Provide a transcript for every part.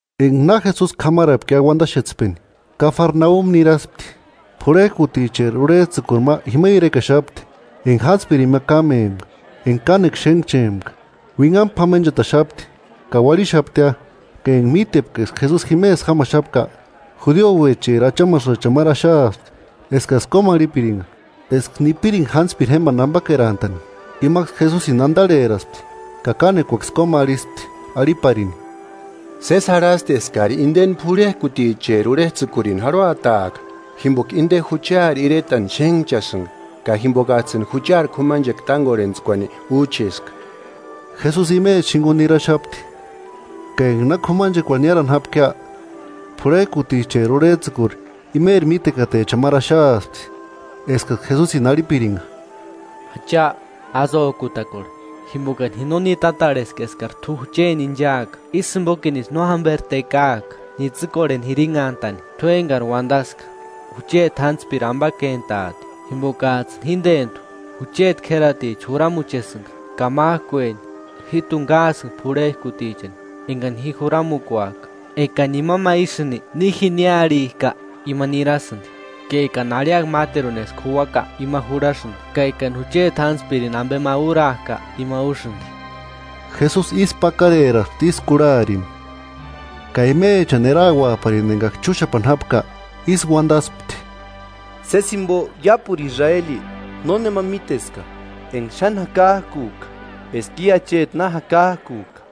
Enga na Jesusi k'amarapkia uandaxetspeni, Kafarnaumi niraspti. P'urhejkuticheri urhejtsïkuri ma jima irekaxapti enga jántspirini ma kámempka enga kánekua xénhchempka, uinhamu p'amenchataxapti ka uarhixaptia. Ka enga mítepka eska Jesusi jimesï jámaxapka, judiouecheri achamasïchani máru axaaspti eskaksï kómarhipiringa eska nipiringa jántspiri jémbani ambakerantani. Imaksï Jesusini andarheraspti ka kánekuaksï kómarhispti, arhiparini: –Sési jarhasti eskari indeni p'urhejkuticheri urhejtsïkurini jarhuataaka, jimboka inde juchari iretani xénhchasïnga ka jimbokajtsïni juchari k'umanchekua tángorhentskuani úcheska. Jesusi imecha jinguni niraxapti, ka enga na k'umanchekuarhu niárani jápkia, p'urhejkuticheri urhejtsïkuri imeri mítekatechani máru axaaspti, eskaksï Jesusini arhipiringa: “Acha, ásï ójkutakorhe, jimbokani ji no nitatarheska eskari t'u jucheni inchaaka; ísï jimbokinisï no jamberi tekaaka nitsïkorheni jirinhantani. T'u engari uandaska, jucheti jántspiri ambakentaati. Jimbokajtsïni jíndentu jucheti k'ératicha juramuchesïnga, ka májkueni jíjtuni káasïnga p'urhejkutichani engani ji juramukuajka, Ekani imani ma ísïni, ni jini arhijka, ima nirasïndi; ka ekani arhiaka máteruni eska juuaka, ima jurhasïndi; ka ekani jucheti jántspirini ambe ma úrajka, ima úsïndi.” Jesusi ísku pakareraspti ísï kurharini, ka imechani erauaparini engaksï chúxapani jápka, ísï uandaspti: –Sési jimbo iápuru Israeli nónemani míteska enga xáni jakajkujka eska i acheti na jakakujka.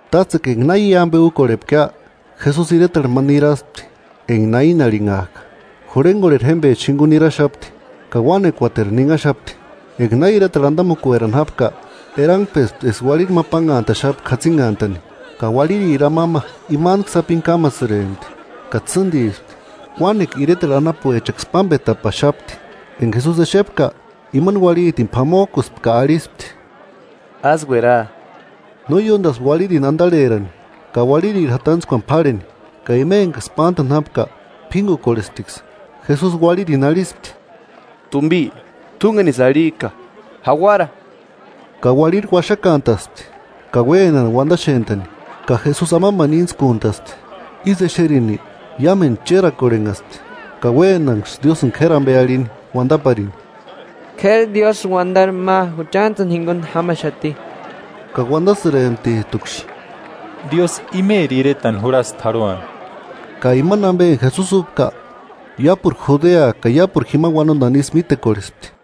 Tátsekua enga na i ambe úkorhepkia, Jesusi iretarhu ma niraspti enga Naini arhinhajka. Jurhengorheri jémbecha jinguni niraxapti ka uánekuateru ninhaxapti. Enga na iretarhu andamukuerani jápka, erangpespti eska uarhiri ma pánhantaxapka jatsinhantani, ka uarhiriri amamba imantku sapini kámasïrempti ka tsîndispti. Uánekua iretarhu anapuechaksï pámbetapaxapti. Enga Jesusi exepka, imani uarhitini p'amojkuspti ka arhispti: –Ásï uera. No ióndaspti uarhirini andarherani ka uarhiriri jatantskuani p'árheni, ka ima engaksï pántani jápka p'íngukukorhesptiksï. Jesusi uarhirini arhispti: –Tumbi, t'úngenisï arhijka: ¡Jauara! Ka uarhiri uaxakantaspti ka uénani uandaxentani, ka Jesusi amambani íntskuntaspti. Ísï exerini, iámendu chérakorhenhaspti ka uénanksï Diósïni k'éri ambe arhini uandaparini: –K'éri Diósïri uandari ma juchantsïni jinguni jámaxati. Ka uandasïremptijtuksï: –Diósï imeri iretani jurhasti jarhuani. Ka imani ambe enga Jesusi úpka iápuru Judea ka iápuru jima uanondani isï mítekorhespti.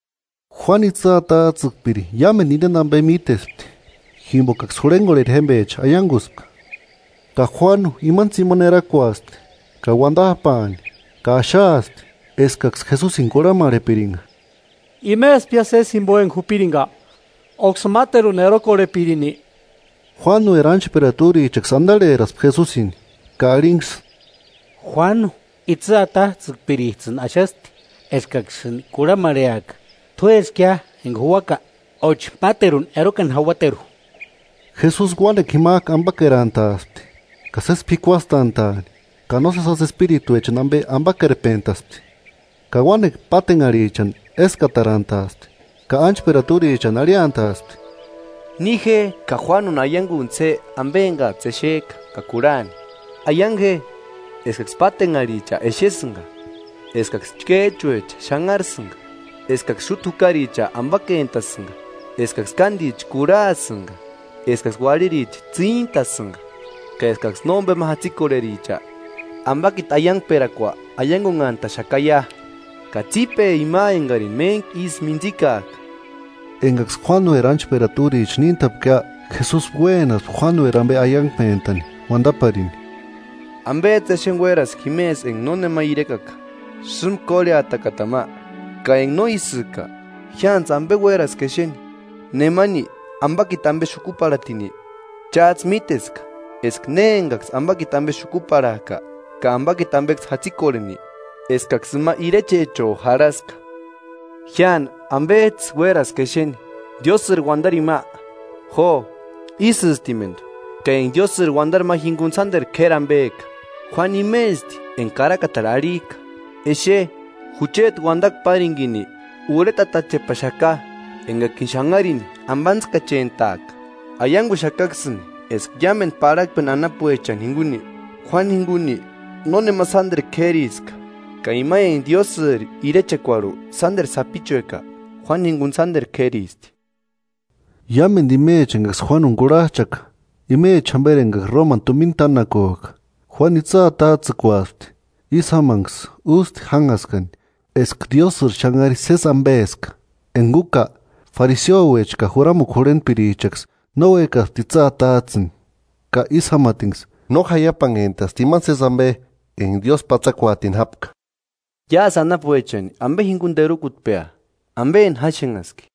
Juánu itsï atajtsïkpiri iámendu indeni ambe mítespti, jimbokaksï jurhengorheri jémbecha aianguspka. Ka Juánu imani tsimani erakuaspti ka uandajpaani ka axaaspti, eskaksï Jesusini kurhamarhepiringa: ¿Imespia sési jimbo enga jupiringa, óksï máteruni erokorhepirinki? Juánueri ánchperata úrichaksï andarheraspti Jesusini ka arhinksï: –Juánu itsï atajtsïkpirijtsïni axasti eskaksïni kurhamarheaka t'úeskia enga juuaka, óchi máteruni erokani jauateru. Jesusi uánekua jimajku ambakerantaaspti ka sési p'ikuastantaani, ka nósesi jásï espirituechani ambe ambakerpentaspti, ka uánekua pátenharhichani eskatarantaaspti. Ka ánchperata úrichani arhiantaaspti: –Ni je ka Juánuni aianguntsï je ambe engajtsï exejka ka kurhani. Aiangu je eskaksï pátenharhicha exesïnga, eskaksï chkéjchuecha xánharasïnga, eskaksï xúta jukaricha ambakentasïnga, eskaksï kándicha kurhasïnga, eskaksï uarhiricha tsíntasïnga ka eskaksï nómbema jatsikorhericha ambakiti aiangperakua aiangunhantaxakaia. ¡Ka tsípe ima engarini méntku isï mintsikajka! Engaksï Juánueri ánchperata úricha níntapkia, Jesusi uénaspti Juánueri ambe aiangpentani uandaparini: “¿Ambejtsï exeni uéraski jimesï enga nónema irekaka? ¿Sïmba kórheatakatani ma? Ka enga no ísïka ¿Jiántsï ambe uéraski exeni? ¿Nemani ambakiti ambe xukuparhatini? Chájtsï míteska eska ne engaksï ambakiti ambe xukuparhajka ka ambakiti ambeksï jatsikorheni, eskaksï ima irechecho jarhaska. Jiáni, ¿Ambejtsï uéraski exeni? ¿Diósïri uandarini ma? Jo, ísïstimendu, ka enga Diósïri uandari ma jinguni sánderu k'éri ambeka. Juánu imesti enga karakatarhu arhijka: Exe, jucheti uandakua párinkini urhetatachepaxaka, engakini xanharini ambantskachentaaka. Aianguxakaksïni eska iámendu parhakpeni anapuechani jinguni, Juánu jinguni nónema sánderu k'ériska; ka ima enga Diósïri irechekuarhu sánderu sapichueka, Juánu jinguni sánderu k'éristi.” Iámendu imechani engaksï Juánuni kurhajchaka, imecha jamberi engaksï Romani tumina tánakujka, Juánu itsï atajtsïkuasti, ísï jámanksï ústi jánhaskani eska Diósïri xanhari sési ambeska; Enga úka, fariseouecha ka juramukua jurhentpirichaksï no uékasti itsï atajtsïni, ka ísï jámatinksï no jaiapanhentasti imani sési ambe enga Diósï patsakuaatini jápka. “¿Iásï anapuechani ambe jinguni terukutpea? ¿Ambeni jáxenhaski?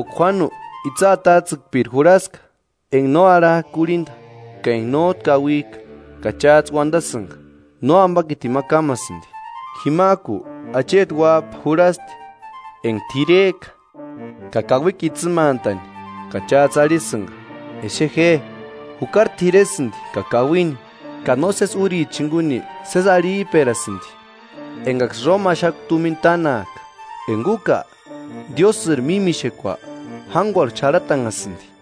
Jimboka Juánu itsï atajtsïkpiri jurhaska enga no arhajka kurhinda ka enga nójtu kauijka, ka chájtsï uandasïnga: ‘Nóambakitini ma kámasïndi.’ Jimajku acheti Uájpa jurhasti, enga t'irejka ka kauikua itsïmantani, ka chájtsï arhisïnga: ‘Exe je, jukari t'iresïndi ka kauini, ka nósesi úrichani jinguni sési arhijperasïndi engaksï Roma axakua tumina tánajka.’ Enga úka, Diósïri mímixekua jánguarhu xarhatanhasïndi.”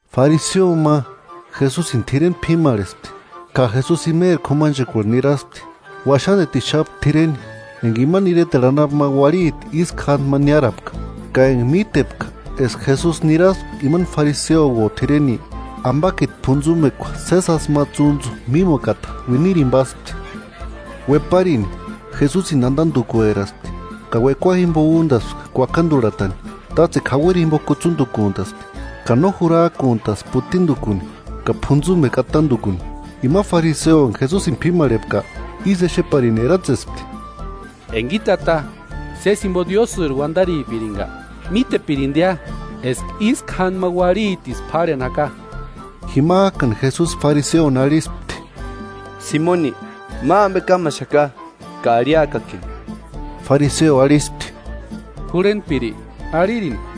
Fariseo ma Jesusini t'ireni p'imarhespti, ka Jesusi imeri k'umanchekuarhu niraspti. Uaxandetixapti t'ireni, enga imani iretarhu anapu ma uarhiti ísku jándi ma niárapka, ka enga mítepka eska Jesusi niraspka imani fariseouo t'ireni, ambakiti p'untsumekua sési jásï ma tsúntsu mímukukata uiniratini páspti. Ueparini, Jesusini andandukueraspti ka uekua jimbo úndaspti kuakandurhatani, tátsekua jauiri jimbo kutsundukuntaspti, ka no jurajkuntaspti putindukuni ka p'untsumekua atandukuni. Ima fariseo enga Jesusini p'imarhepka, ísï exeparini eratsespti: “Enga i tata sési jimbo Diósïri uandaripiringa, mítepirindia eska ísku jándi ma uarhitisï p'árheni jaka.” Jimajkani Jesusi fariseoni arhispti: –Simoni, ma ambe kámaxaka ka arhiakakini. Fariseo arhispti: –Jurhentpiri, arhirini.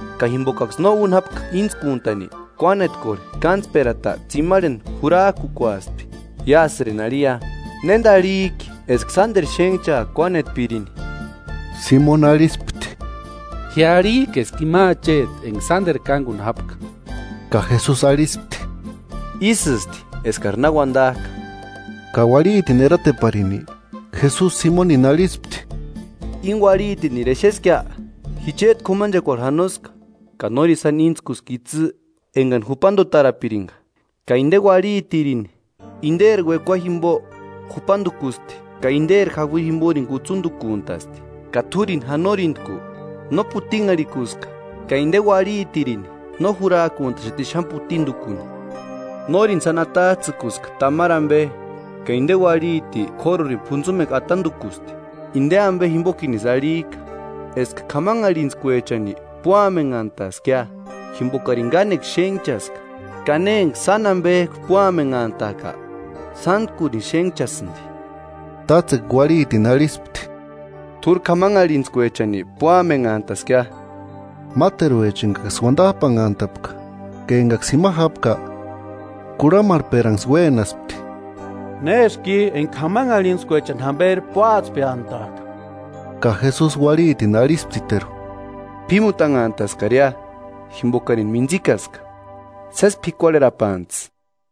ka jimbokaksï no úni jápka íntskuntani, kuánetkorheri kántsperata tsimarheni jurajkukuaspti. Iásïrini arhiia, ¿Néndi arhijki eska sánderu xénhchaaka kuánetpirini? Simoni arhispti: –Ji arhijka eska ima acheti enga sánderu kánguni jápka. Ka Jesusi arhispti: –Ísïsti eskari na uandajka. Ka uarhitini erateparini, Jesusi Simonini arhispti: –Íni uarhitiniri exeskia; ji chéti k'umanchekuarhu janoska, ka nórini sáni íntskuska itsï engani jupandutarapiringa; ka inde uarhitirini inderi uekua jimbo jupandukusti, ka inderi jauiri jimborini kutsundukuntasti, ka t'úrini janorintku, no putinharhikuska, ka inde uarhitirini no jurajkuntaxati xáni putindukuni. Nórini sáni atajtsïkuska tamari ambe ka inde uarhiti k'órurini p'untsumekua atandukusti. Indeni ambe jimbokinisï arhijka eska k'amanharhintskuechani púamenhantaskia, jimbokarini kánekua xénhchaska; ka ne enga sáni ambejku púamenhantajka, sántkurini xénhchasïndi. Tátsekua uarhitini arhispti: –T'úri k'amanharhintskuechani púamenhantaskia. Máteruecha engaksï uandajpanhantapka ka engaksï jima jápka kurhamarhperanksï uénaspti: –¿Néski i, enga k'amanharhintskuechani jamberi púatspeantajka? Ka Jesusi uarhitini arhisptiteru: –P'ímutanhantaskaria jimbokarini mintsikaska; sési p'ikuarherapantsï.